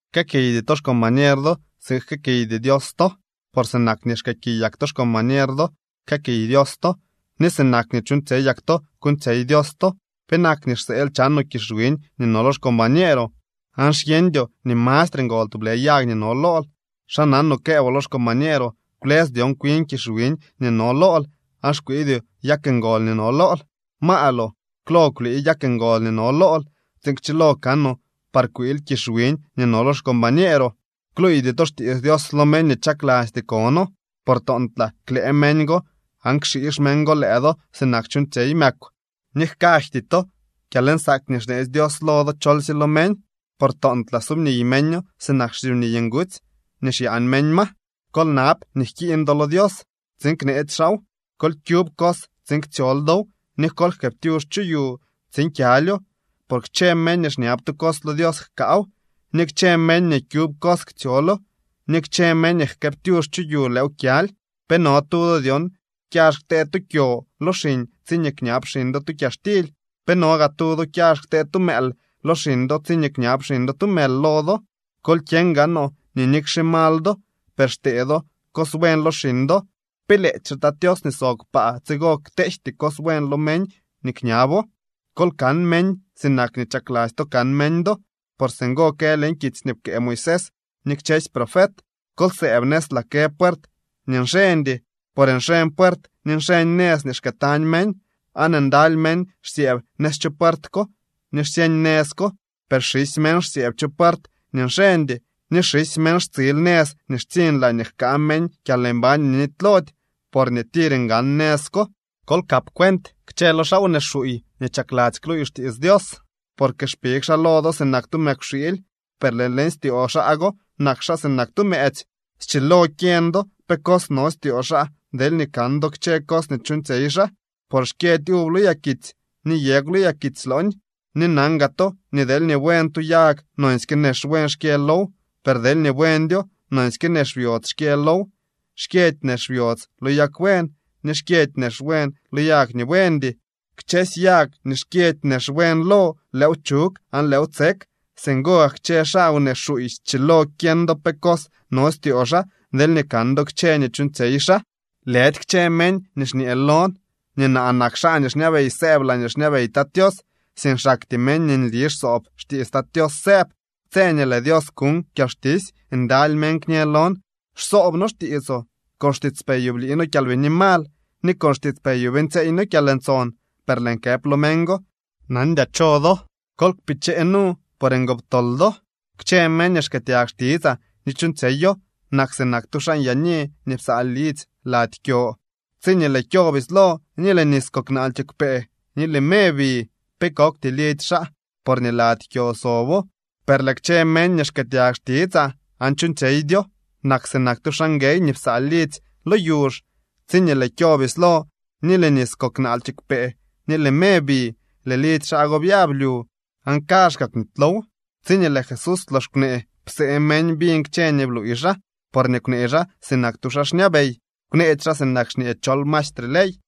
’Jkëëkiydy to xcombañer do tsiin jkëëkiydy Dios to. Por sinak nii xkëëkiyak to xcombañer do jkëëkiy Dios to, ni sinak nii chuuñtsyeyak to kuuñtsyey Dios to. ¿Penak nii xseel chanoo kizh wiñ nii no lo xcombañeeroo aan xyeñdyoo nii mastre ngol tublë yag nii no lool? ¿Xa nanoo këëboo lo xcombañeeroo: “Kwlës dyon kwin kizh wiñ nii no lool”, aan xkwiidyoo yag ngol nii no lool? ¡Maaloo! Klo kwlii yag ngol nii no lool tsiin kchilo kanoo par kwiil kizh wiñ nii no lo xcombañeeroo. ’Kluuydy to xtiits Dios lo meñ nii chaklasty kono, por toontlaa klëë meñ go aan kxiix meñ go lëë do sinak chuuñtsyey mëkw. Ni jkaydy to kyalnsaak nii xneetsy Dios lo do cholsye lo meñ, por toontlaa subniy meño sinak xsyubniy ngutsy nii xyaan meñ ma. ’Kol nab nii jkiiñ do lo Dios tsiin kneetsy xaaw, kol kyub cos tsiin ktsyool dow, ni kol jkëëptyux chu yu tsiin kyalyo. Por kchë meñ nii kñab tu cos lo Dios jkaaw, ni kchë meñ nii kyub cos ktsyolo, ni kchë meñ nii jkëëptyux chu yu lëëw kyaly. ’¿Pe no tu do dyon kyax ktee tu kyo lo xiñ tsiñee kñab xiñ do tu kyaxtily? ¿Pe no gaa tu do kyax ktee tu mëël lo xiñ do tsiñee kñab xiñ do tu mël lo do? Kol kyeñ gaanoo nii nikxe mal do, per xtee do cos buen lo xiñ do. ¿Pe lëëdyxe Tat Tios nii sob kpaa tsigo kteejty cos buen lo meñ nii kñabo? ’Kol kan meñ sinak nii chakladzy to kan meñ do. Por singo kë leñ kitsy nii pkëë Moisés ni kchësy profet. ’Kol sëëb nëz laa kë puert nii nxeñdy. Por nxeñ puert ni nxeñ nëz nii xkëëtañ meñ, aan ndaly meñ xsyëëb nëz chu puert ko ni xsyeñ nëz ko. Per xisy meñ xsyëëb chu puert nii nxeñdy, ni xisy meñ xtsiil nëz nii xtsiñ laañee jkaa meñ kyalmbañ nii nitylody, porñee tir ngan nëz ko. ’Kol kap cuent kchë lo xaa wnee xuuy nii chakladzy kluuy xtiits Dios. Porque xpig xaa lo do sinak tu mëkwxiily, per lëë leñ styoo xaa go nak xaa sinak tu mëëtsy. Schilo kyeñ do pe cos no styoo xaa deelñee kan do kchë cos nii chuuñtsyey xaa, por xkyëdy uv lo yakitsy ni yegw lo yakitsy looñ. Ni nan gaa to nii deelñee buen tu yag nonsyke nex buen xkyë low, per deelñee buendyo nonsyke nex byodz xkyë low. Xkyëdy nex byodz lo yag buen, ni xkyëdy nex buen lo yag nii buendy. Kchësy yag nii xkyëdy nex buen lo lëëw chug aan lëëw tsek. Singo gak kchë xaa wnee xuuy schilo kyeñ do pe cos no styoo xaa deelñee kan do kchë nii chuuñtsyey xaa. ’Lëdy kchë meñ nii xñee lon nii naa nak xaa nii xñabey sëëb laañee xñabey Tat Tios, sink xaktyee meñ nii nli xsoob xtiits Tat Tios sëëb. Tse nii lëë Dios kuñ kyalxtisy ndaly meñ kñë lon: “Xsoob noo xtiitsoo. Con xtiitspeyoo blii noo kyalbini mal, ni con xtiitspeyoo beeñtsyeey noo kyalntson.” Per lëën këp lo meñ go: “Nandyaa cho do. Kol kpichee nu, por ngoptol do.” ’Kchë meñ nii xkëëtyag xtitsaa ni chuuñtsyeyo nak sinak tu xaa nyaani nii psaa lidzy lady kyo. Tsiñee lëë kyo bislo ni lëë nis kok naal kiigwpee ni lëë me bi, pe kokty lidzy xaa porñee lady kyo sobo. Per lëë kchë meñ nii xkëëtyag xtitsaa aan chuuñtsyeydyo nak sinak tu xaa nguey nii psaa lidzy lo yuzh. Tsiñee lëë kyo bislo ni lëë nis kok naal kiigwpee ni lëë me bi, lëë lidzy xaa byablyu, ¡aan kaazhkaa kwnitylow! Tsiñee lëë Jesús lox kwnee, psee meñ biñ kchë nii bluuy xaa, porñee kwnee xaa sinak tu xaa xñabey, kwneedy xaa sinak xñee chol mastre ley.